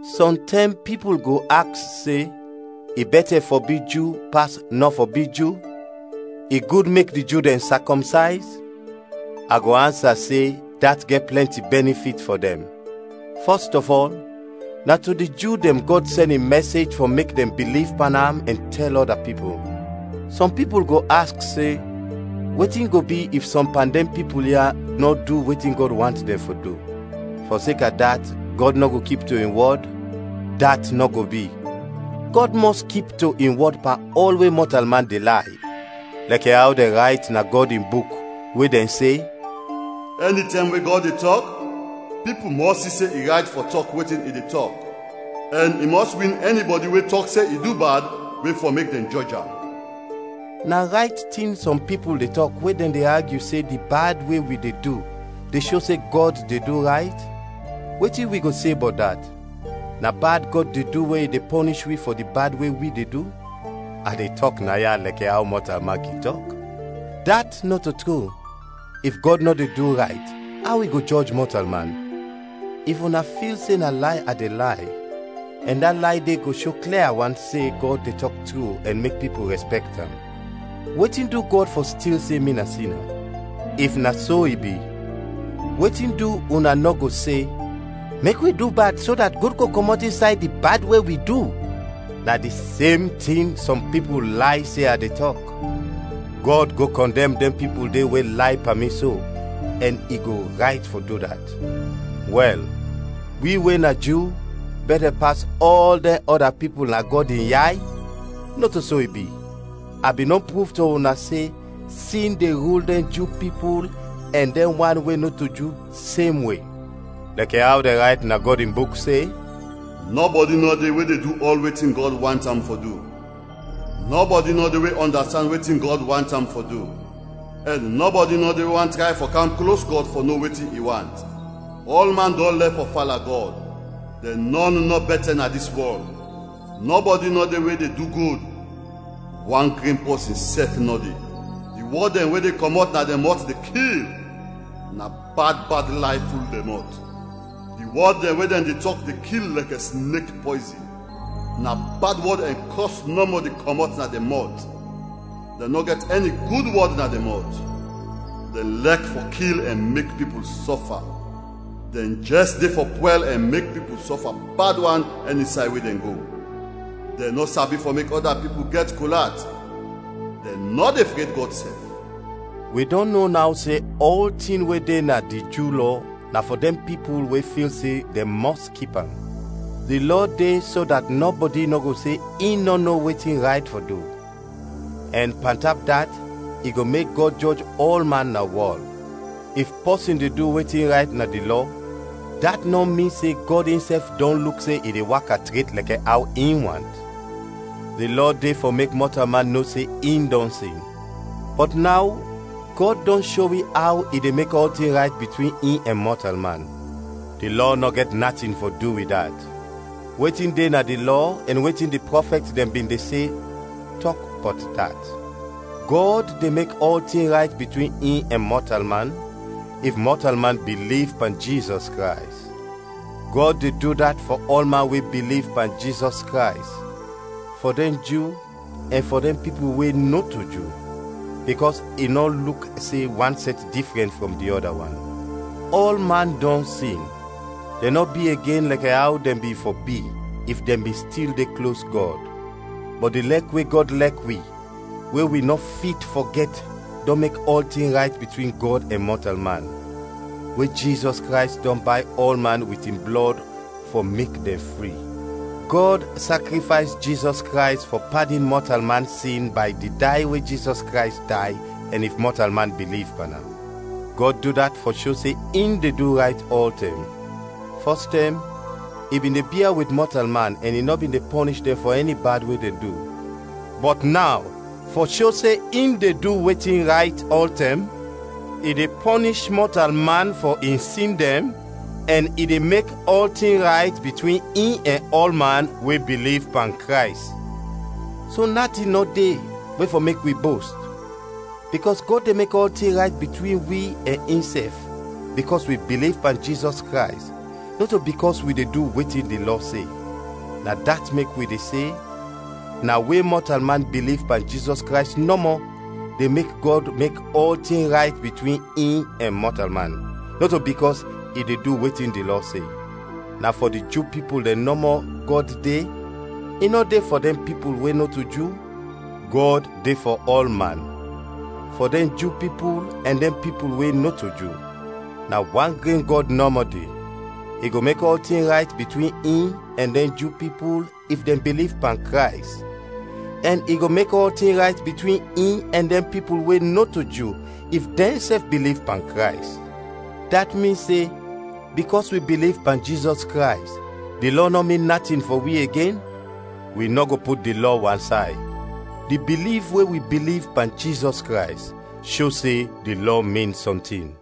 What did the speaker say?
Sɔntɛm pipul go aks se, i bɛtɛ fɔ bi Ju pas nɔ fɔ bi Ju? I gud mek di Ju dɛn sakɔmsayz? A go ansa se dat gɛt plɛnti bɛnifit fɔ dɛn. Fɔst ɔf ɔl, na to di Ju dɛn Gɔd sɛn in mɛsej fɔ mek dɛn biliv pan am ɛn tɛl ɔda pipul. Sɔm pipul go aks se, wetin go bi if sɔm pan dɛn pipul ya nɔ du wetin Gɔd want dɛn fɔ du? Fɔseka dat, Gɔd nɔ go kip to in wɔd? Dat nɔ go bi! Gɔd mɔs kip to in wɔd pan ɔl we mɔtalman de lay. Lɛkɛ aw dɛn rayt na Gɔd in Buk, we dɛn se, “Ɛnitɛm we Gɔd de tɔk, pipul mɔs si se i rayt fɔ tɔk wetin i de tɔk; ɛn i mɔs win ɛnibɔdi we tɔk se i du bad we fɔ mek dɛn jɔj am.” Na rayt tin sɔm pipul de tɔk we dɛn de agyu se di bad we wi de du de sho se Gɔd de du rayt? Wetin wi go se bɔt dat? Na bad Gɔd de du we i de pɔnish wi fɔ di bad we wi de du? (A de tɔk naya lɛkɛ aw mɔtalman kin tɔk.) Dat nɔto tru! If Gɔd nɔ de du rayt, aw i go jɔj mɔtalman? If una fil se na lay a de lay, ɛn da lay de go sho klia wan se Gɔd de tɔk tru ɛn mek pipul rɛspɛkt am, wetin du Gɔd fɔ stil se mi na sina? If na so i bi, wetin du una nɔ go se, “Mek wi du bad so dat gud go kɔmɔt insay di bad we wi du?” Na di sem tin sɔm pipul lay se a de tɔk. Gɔd go kɔndɛm dɛn pipul de we lay pan mi so, ɛn i go rayt fɔ du dat. Wɛl, wi we na Ju bɛtɛ pas ɔl dɛn ɔda pipul na Gɔd in yay? Nɔto so i bi! A bin dɔn pruv to una se sin de rul dɛn Ju pipul ɛn dɛn wan we nɔto Ju, semwe. Lɛkɛ aw dɛn rayt na Gɔd in Buk se: “Nɔbɔdi nɔ de we de du ɔl wetin Gɔd want am fɔ du, nɔbɔdi nɔ de we ɔndastand wetin Gɔd want am fɔ du, ɛn nɔbɔdi nɔ de we want tray fɔ kam klos Gɔd fɔ no wetin i want. Ɔlman dɔn lɛf fɔ fala Gɔd, dɛn nɔn nɔ bɛtɛ na dis wɔl; nɔbɔdi nɔ de we de du gud, wan gren pɔsin sɛf nɔ de. Di wɔd dɛn we de kɔmɔt na dɛn mɔt de kil; na bad bad lay ful dɛn mɔt, di wɔd dɛn we dɛn de tɔk de kil lɛkɛ snek pɔyzin; na bad wɔd ɛn kɔs nɔmɔ de kɔmɔt na dɛn mɔt, dɛn nɔ gɛt ɛni gud wɔd na dɛn mɔt. Dɛn lɛk fɔ kil ɛn mek pipul sɔfa; dɛn jɛs de fɔ pwɛl ɛn mek pipul sɔfa bad wan ɛnisay we dɛn go. Dɛn nɔ sabi fɔ mek ɔda pipul gɛt kol at, dɛn nɔ de fred Gɔd sɛf.” Wi dɔn no naw se ɔltin we de na di Ju Lɔ na fɔ dɛn pipul we fil se dɛn mɔs kip am. Di Lɔ de so dat nɔbɔdi nɔ go se in nɔ no wetin rayt fɔ du, ɛn, pantap dat i go mek Gɔd jɔj ɔlman na wɔl. If pɔsin de du wetin rayt na di Lɔ dat nɔ min se Gɔd insɛf dɔn luk se i de waka tret lɛkɛ aw in want; di Lɔ de fɔ mek mɔtalman no se in dɔn sin. Bɔt naw Gɔd dɔn sho wi aw i de mek ɔltin rayt bitwin in ɛn mɔtalman; di Lɔ nɔ gɛt natin fɔ du wit dat. Wetin de na di Lɔ ɛn wetin di prɔfɛt dɛn bin de se, tɔk bɔt dat. Gɔd de mek ɔltin rayt bitwin in ɛn mɔtalman, if mɔtalman biliv pan Jizɔs Krays. Gɔd de du dat fɔ ɔlman we biliv pan Jizɔs Krays, fɔ dɛn Ju ɛn fɔ dɛn pipul we nɔto Ju, bikɔs i nɔ luk se wan sɛt difrɛn frɔm di ɔda wan. Ɔlman dɔn sin, dɛn nɔ bi igen lɛkɛ aw dɛn bin fɔ bi, if dɛn bin stil de klos Gɔd. Bɔt di lɛk we Gɔd lɛk wi we wi nɔ fit fɔ gɛt dɔn mek ɔltin rayt bitwin Gɔd ɛn mɔtalman, we Jizɔs Krays dɔn bay ɔlman wit in blɔd fɔ mek dɛn fri. Gɔd sakrifays Jizɔs Krays fɔ padin mɔtalman sin bay di day we Jizɔs Krays day, ɛn if mɔtalman biliv pan am. Gɔd du dat fɔ sho se in de du rayt ɔltɛm. Fɔs tɛm, i bin de bia wit mɔtalman ɛn i nɔ bin de pɔnish dɛn fɔ ɛni bad we dɛn du; bɔt naw fɔ sho se in de du wetin rayt ɔltɛm, i de pɔnish mɔtalman fɔ in sin dɛn ɛn i de mek ɔltin rayt bitwin in ɛn ɔlman we biliv pan Krays. So natin nɔ de we fɔ mek wi bost, bikɔs Gɔd de mek ɔltin rayt bitwin wi ɛn insɛf bikɔs wi biliv pan Jizɔs Krays, nɔto bikɔs wi de du wetin di Lɔ se. Na dat mek wi de se: Na we mɔtalman biliv pan Jizɔs Krays nɔmɔ de mek Gɔd mek ɔltin rayt bitwin in ɛn mɔtalman, nɔto bikɔs i de du wetin di Lɔ se. Na fɔ di Ju pipul dɛn nɔmɔ Gɔd de? I nɔ de fɔ dɛn pipul we nɔto Ju? Gɔd de fɔ ɔlman, fɔ dɛn Ju pipul ɛn dɛn pipul we nɔto Ju. Na wan gren Gɔd nɔmɔ de. I go mek ɔltin rayt bitwin in ɛn dɛn Ju pipul if dɛn biliv pan Krays, ɛn i go mek ɔltin rayt bitwin in ɛn dɛn pipul we nɔto Ju if dɛnsɛf biliv pan Krays. Dat min se, bikɔs wi biliv pan Jizɔs Krays, di Lɔ nɔ min natin fɔ wi igen? Wi nɔ go put di Lɔ wansay. Di biliv we wi biliv pan Jizɔs Krays sho se di Lɔ min sɔntin.